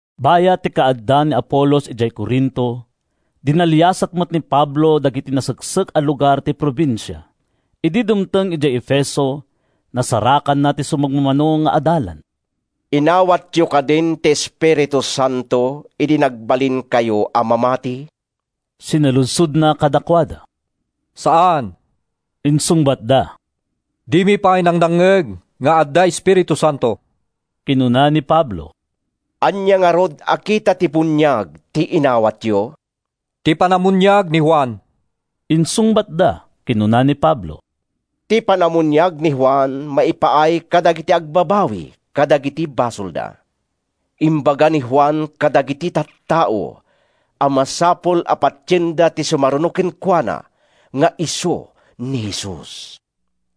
Bayat ti kaadda ni Apolos idiay Corinto, dinaliasat met ni Pablo dagiti naseksek a lugar ti probinsia. Idi dumteng idiay Efeso, nasarakanna ti sumagmamano nga adalan. “Inawatyo kadin ti Espiritu Santo idi nagbalinkayo a mamati?” sinaludsodna kadakuada. “Saan,” insungbatda. “Dimi pay nangnangngeg nga adda Espiritu Santo.” Kinuna ni Pablo, “Ania ngarud a kita ti buniag ti inawatyo?” “Ti panamuniag ni Juan,” insungbatda. Kinuna ni Pablo, “Ti panamuniag ni Juan maipaay kadagiti agbabawi kadagiti basolda. Imbaga ni Juan kadagiti tattao a masapul a patienda ti sumaruno kenkuana nga isu ni Jesus.”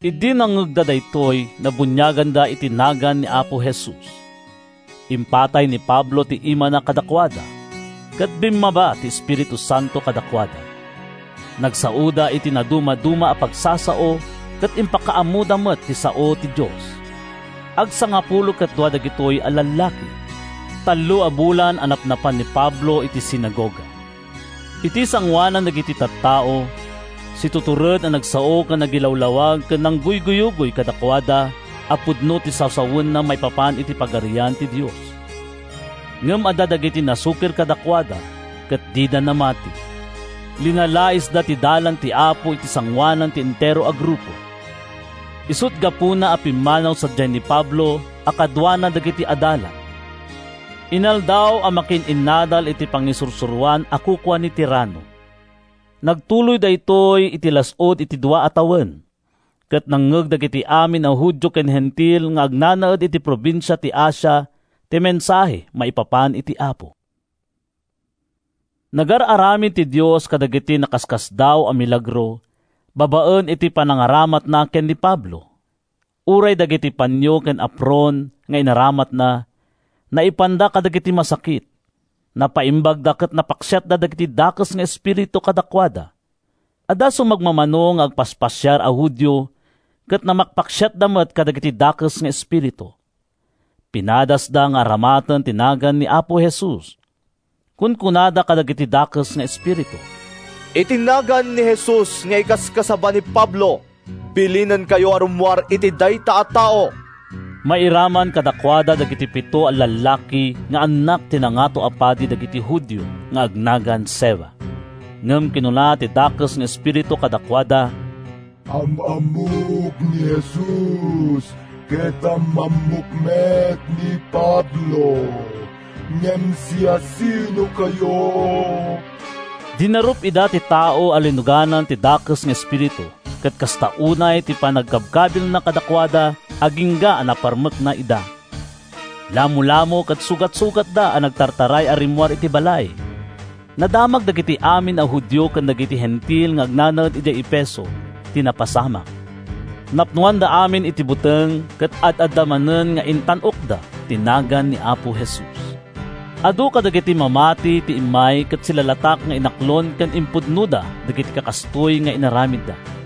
Idi nangngegda daytoy, nabuniaganda iti nagan ni Apo Jesus. Impatay ni Pablo ti imana kadakuada, ket bimmaba ti Espiritu Santo kadakuada. Nagsaoda iti nadumaduma a pagsasao ket impakaammoda met ti sao ti Dios. Agsangapulo ket dua dagitoy a lallaki. Tallo a bulan a napnapan ni Pablo iti sinagoga. Iti sangoanan dagiti tattao, situtured a nagsao ken nagilawlawag ken nangguyugoy kadakuada a pudno ti sasawenna maipapan iti Pagarian ti Dios. Ngem adda dagiti nasukir kadakuada ket dida namati. Linalaisda ti Dalan ti Apo iti sangoanan ti entero a grupo. Isut’ gapuna a pimmanaw sadiay ni Pablo a kaduana dagiti adalan. Inaldaw a makiin-innadal iti pangisursuroan a kukua ni Tirano. Nagtuloy daytoy iti las-ud ti dua a tawen. Ket nangngeg dagiti amin a Judio ken Hentil nga agnanaed iti probinsia ti Asia ti mensahe maipapan iti Apo. Nagar-aramid ti Dios kadagiti nakaskasdaaw a milagro babaen iti panangaramatna ken ni Pablo. Uray dagiti panio ken apron nga inaramatna, naipanda kadagiti masakit. Napaimbagda ket napaksiat dagiti dakes nga espiritu kadakuada. Adda sumagmamano nga agpaspasiar a Judio ket mamakpaksiatda met kadagiti dakes nga espiritu. Pinadasda nga aramaten ti nagan ni Apo Jesus. Kunkunada kadagiti dakes nga espiritu: “Iti nagan ni Jesus nga ikaskasaba ni Pablo, bilinenkayo a rummuar iti dayta a tao.” Mairaman kadakuada dagiti pito a lallaki nga annak ti Nangato a Padi dagiti Judio nga agnagan Sceva. Ngem kinuna ti dakes nga espiritu kadakuada, “Am-ammok ni Jesus ket am-ammok met ni Pablo. Ngem siasinokayo?” Dinarup ida ti tao a linuganan ti dakes nga espiritu ket kasta unay ti panangkabkabilna kadakuada agingga a naparmekna ida. Lamolamo ken sugat-sugatda a nagtataray a rimmuar iti balay. Nadamag dagiti amin a Judio ken dagiti Hentil nga agnanaed idiay Efeso ti napasamak. Napnoanda amin iti buteng ket ad-adda manen nga intan-okda ti nagan ni Apo Jesus. Adu kadagiti mamati ti immay ket silalatak nga inaklon ken impudnoda dagiti kakastoy nga inaramidda.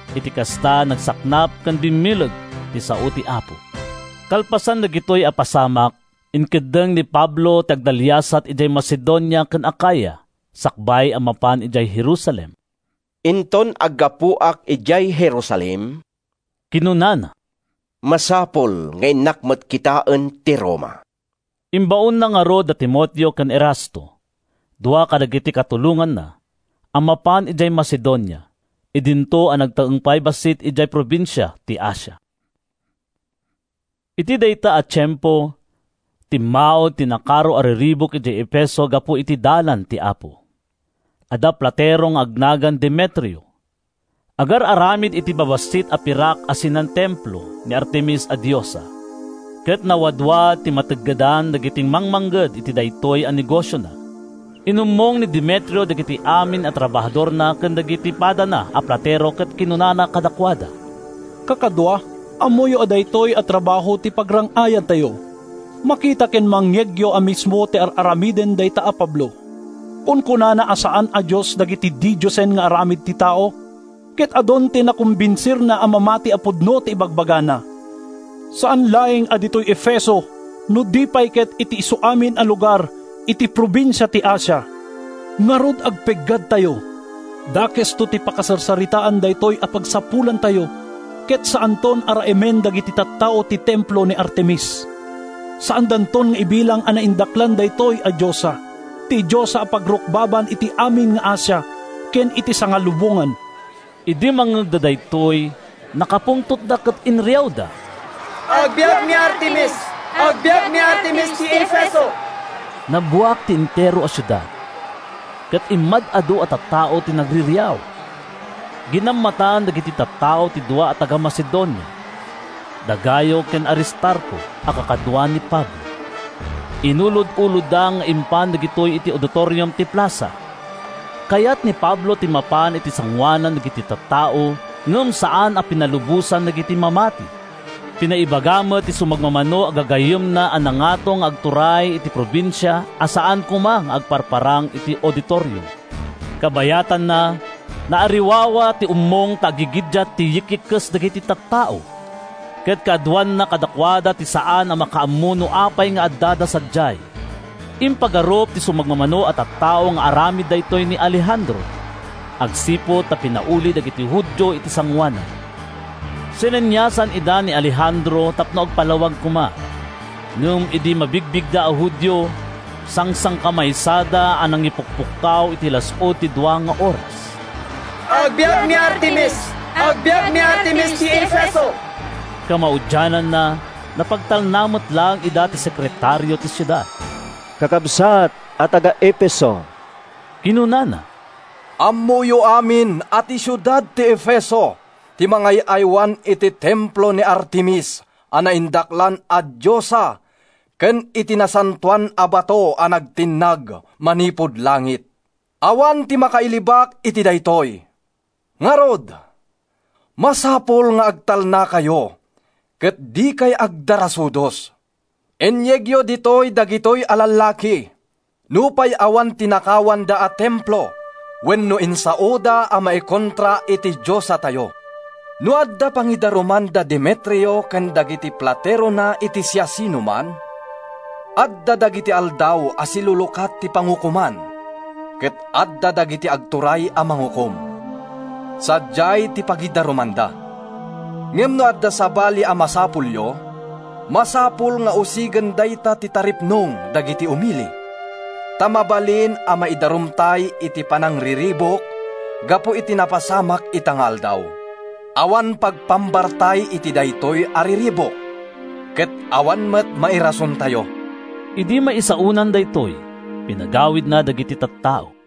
Iti kasta, nagsaknap ken bimmileg ti sao ti Apo. Kalpasan dagitoy a pasamak, inkeddeng ni Pablo ti agdaliasat idiay Macedonia ken Acaya sakbay a mapan idiay Jerusalem. “Inton aggapuak idiay Jerusalem,” kinunana, “masapul nga innak met kitaen ti Roma.” Imbaonna ngarud da Timoteo ken Erasto, dua kadagiti katulonganna, a mapan idiay Macedonia, idinto a nagtaeng pay bassit idiay probinsia ti Asia. Iti dayta a tiempo, timmaud ti nakaro a riribuk idiay Efeso gapu iti Dalan ti Apo. Adda platero nga agnagan Demetrio. Agar-aramid iti babassit a pirak a sinan-templo ni Artemis a diosa, ket nawadwad ti mateggedan dagiti mangmangged iti daytoy a negosiona. Inummong ni Demetrio dagiti amin a trabahadorna ken dagiti padana a platero ket kinunana kadakuada: “Kakadua, ammoyo a daytoy a trabaho ti pagrang-ayantayo. Makita ken mangngegyo a mismo ti ar-aramiden dayta a Pablo. Kunkunana a saan a dios dagiti didiosen nga aramid ti tao. Ket adun ti nakumbinsirna a mamati a pudno ti ibagbagana, saan laeng a ditoy Efeso no di pay ket iti isuamin a lugar iti probinsia ti Asia. Ngarud, agpeggadtayo. Dakesto ti pakasarsaritaan daytoy a pagsapulantayo ket saanton a raemen dagiti tattao ti templo ni Artemis. Saandanton nga ibilang a naindaklan daytoy a diosa, ti diosa a pagrukbaban iti amin nga Asia ken iti sangalubongan!” Idi mangngegda daytoy, nakapungtotda ket inriawda, “Agbiag ni Artemis! Agbiag ni Artemis ti Efeso!” Nabuak ti entero a siudad, ket immad-adu a tattao ti nagririaw. Ginammatan dagiti tattao ti dua a taga-Macedonia, da Gayo ken Aristarco a kakadua ni Pablo; inulod-ulodda nga impan dagitoy iti auditorium ti plasa. Kayat ni Pablo ti mapan iti sangoanan dagiti tattao ngem saan a pinalubosan dagiti mamati. Pinaibaga met ti sumagmamano a gagayyemna a nangato nga agtuturay iti probinsia a saan koma nga agparparang iti auditorium. Kabayatanna, naariwawa ti ummong ta aggigiddiat ti yik-ikkis dagiti tattao, ket kaaduanna kadakuada ti saan a makaammo no apay nga addada sadiay. Impagarup ti sumagmamano a tattao nga aramid daytoy ni Alejandro, agsipud ta pinauli dagiti Judio iti sangoanan. Sineniasan ida ni Alejandro tapno agpalawag koma, ngem idi mabigbigda a Judio, sangsangkamaysada a nangipukpukkaw iti las-ud ti dua nga oras: “Agbiag ni Artemis! Agbiag ni Artemis ti Efeso!” Kamaudiananna, napagtalna met laeng ida ti sekretario ti siudad. “Kakabsat a taga-Efeso,” kinunana, “ammoyo amin a ti siudad ti Efeso ti mangay-aywan iti templo ni Artemis a naindaklan a diosa ken iti nasantoan a bato a nagtinnag manipud langit. Awan ti makailibak iti daytoy. Ngarud, masapul nga agtalnakayo ket dikay agdardarasudos. Inyegyo ditoy dagitoy a lallaki, nupay awan tinakawanda a templo wenno insaoda a maikontra iti diosatayo. No adda pangidaruman da Demetrio ken dagiti platerona iti siasinoman, adda dagiti aldaw a silulukat ti pangukoman ket adda dagiti agturay a mangukom. Sadiay ti pagidarumanda. Ngem no adda sabali a masapulyo, masapul nga usigen dayta ti taripnong dagiti umili. Ta mabalin a maidarumtay iti panangriribuk gapu iti napasamak ita nga aldaw. Awan pagpambartay iti daytoy a riribuk, ket awan met mairasontayo.” Idi maisaonan daytoy, pinagawidna dagiti tattao.